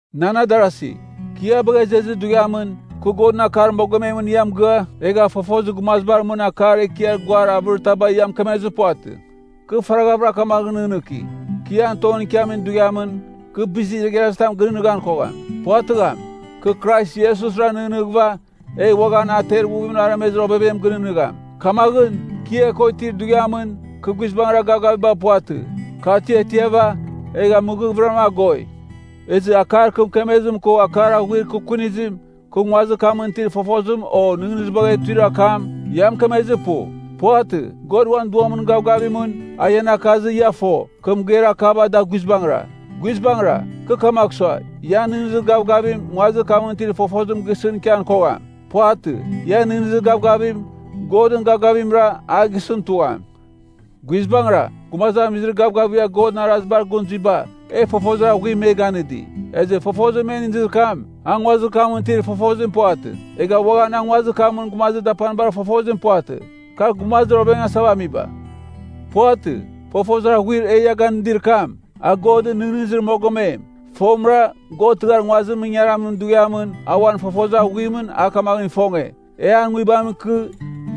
Nan adarasi, kɨ ia bagha izezir dughiamɨn, kɨ Godɨn akar mogomemɨn ia mɨgɨa, egha fofozir gumazibar mɨn akar ekiar guar avɨritaba ia mɨkemezir puvatɨ. Kɨ faraghavɨra kamaghɨn nɨghnɨki, kɨ ian tongɨn ikiamin dughiamɨn, kɨ bizir igharazitam gɨnɨghnɨghan kogham. Puvatɨgham. Kɨ Krais Iesusra nɨghnɨghɨva, egh uaghan a ter ighuvimɨn aremezir ovevem gɨnɨghnɨgham. Kamaghɨn, kɨ ia ko itir dughiamɨn, kɨ guizbangɨra gavgaviba puvatɨ. Kɨ atiatiava, egha mɨghavɨram agoi. Ezɨ akar kɨ mɨkemezim ko akar aghuir kɨ kunizim, kɨ nguazir kamɨn itir fofozim o nɨghnɨzibagh etuir akam, ia mɨkemezir pu. Puvatɨ. God uan Duamɨn gavgavimɨn, a ian akazɨ, ia fo, kɨ mɨgeir akaba da guizbangɨra. Guizbangɨra, kɨ kamagh sua, ian nɨghnɨzir gavgavim nguazir kamɨn itir fofozim gisɨn ikian kogham. Puvatɨ. Ian nɨghnɨzir gavgavim, Godɨn gavgavimra, a gisɨn tugham. Guizbangɨra, gumazamizir gavgavigha Godɨn arazibar gɨn zuiba, e fofozir aghuim me ganɨdi. Ezɨ fofozir me inizir kam, a nguazir kamɨn itir fofozim puvatɨ. Egha uaghan a nguazir kamɨn gumazir dapanibar fofozim puvatɨ, kar gumazir ovengasava amiba. Puvatɨ. Fofozir aghuir e ia ganɨdir kam, a Godɨn nɨghnɨzir mogomem. Fomɨra, God tɨghar nguazimɨn ingaramin dughiamɨn, a uan fofozir aghuimɨn a kamaghɨn ifonge, e an Nguibamɨn ikɨ,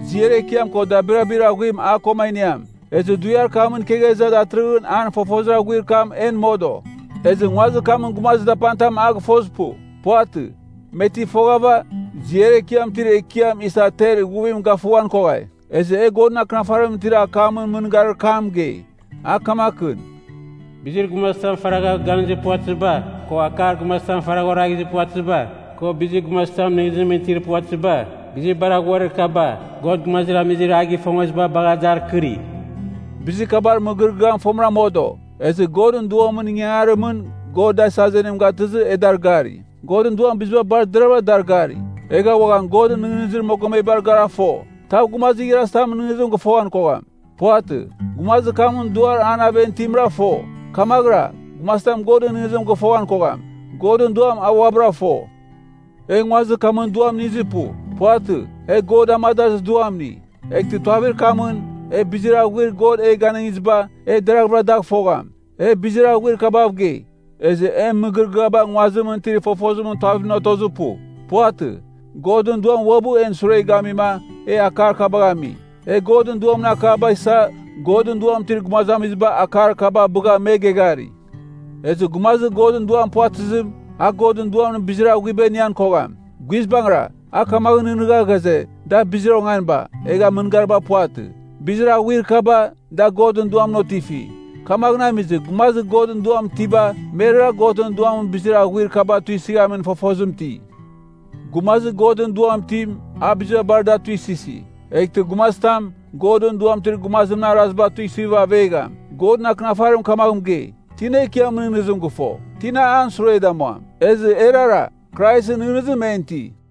ziar ekiam ko dabirabir aghuim a ko a iniam. Ezɨ dughiar kamɨn ikegha iza datɨrɨghɨn an fofozir aghuir kam en modo. Ezɨ, nguazir kamɨn gumazir dapanitam a gɨfozir pu. Puvatɨ. Me ti foghava, ziar ekiam itir Ekiam isa ter ighuvim gafughan koghai. Ezɨ e Godɨn Akɨnafarimɨn itir akamɨn mɨgɨrɨgɨar kam mɨgei, a kamakɨn, “Bizir gumazitam faragha ganizir puvatɨziba, ko akar gumazitam faragha oraghizir puvatɨziba, ko bizir gumazitamɨn nɨghnɨzimɨn itir puvatɨziba, bizir bar aghuir kaba, God gumazamizir a gɨfongeziba bagha dar kɨri.” Bizir kabar mɨgɨrɨgɨam fomɨra modo, ezɨ Godɨn Duamɨn ingangarimɨn God da azenim gatɨzɨ, e dar gari. Godɨn Duam biziba bar deravɨra dar gari, egha uaghan Godɨn nɨghnɨzir mogomebar gara fo. Tav gumazir igharazitamɨn nɨghnɨzim gɨfoghan kogham. Puvatɨ. Gumazir kamɨn duar an aven itimra fo. Kamaghɨra, gumazitam Godɨn nɨghnɨzim gɨfoghan kogham. Godɨn Duam, a uabɨra fo. E nguazir kamɨn duam inizir pu. Puvatɨ. E God amadazir Duam ini. Eghtɨ tuavir kamɨn, e bizir aghuir God e ganɨngiziba, e deraghvɨra dagh fogham. E bizir aghuir kabav gei, ezɨ en mɨgɨrɨgɨaba nguazimɨn itir fofozimɨn tuavimɨn otozir pu. Puvatɨ. Godɨn Duam uabɨ en sure gamima, e akar kabagh ami. E Godɨn Duamɨn akaba isa, Godɨn Duam itir gumazamiziba akar kaba bɨgha me geghari. Ezɨ gumazir Godɨn Duam puvatɨzim, a Godɨn Duamɨn bizir aghuiba inighan kogham. Guizbangɨra, a kamaghɨn nɨghnɨgha ghaze, da bizir onganiba, egha mɨngariba puvatɨ. Bizir aghuir kaba, da Godɨn Duamɨn otifi. Kamaghɨn amizɨ, gumazir Godɨn Duam itiba, merara Godɨn Duamɨn bizir aghuir kaba tuisɨghamin fofozim iti. Gumazir Godɨn Duam itim, a biziba bar da tuisɨsi. Eghtɨ gumazitam, Godɨn Duam itir gumazimɨn araziba tuisɨghɨva avegham. Godɨn Akɨnafarim kamaghɨn mɨgei, “Tina Ekiamɨn nɨghnɨzim gɨfo? Tina an sure damuam?” Ezɨ erara, Kraisɨn nɨghnɨzim en iti.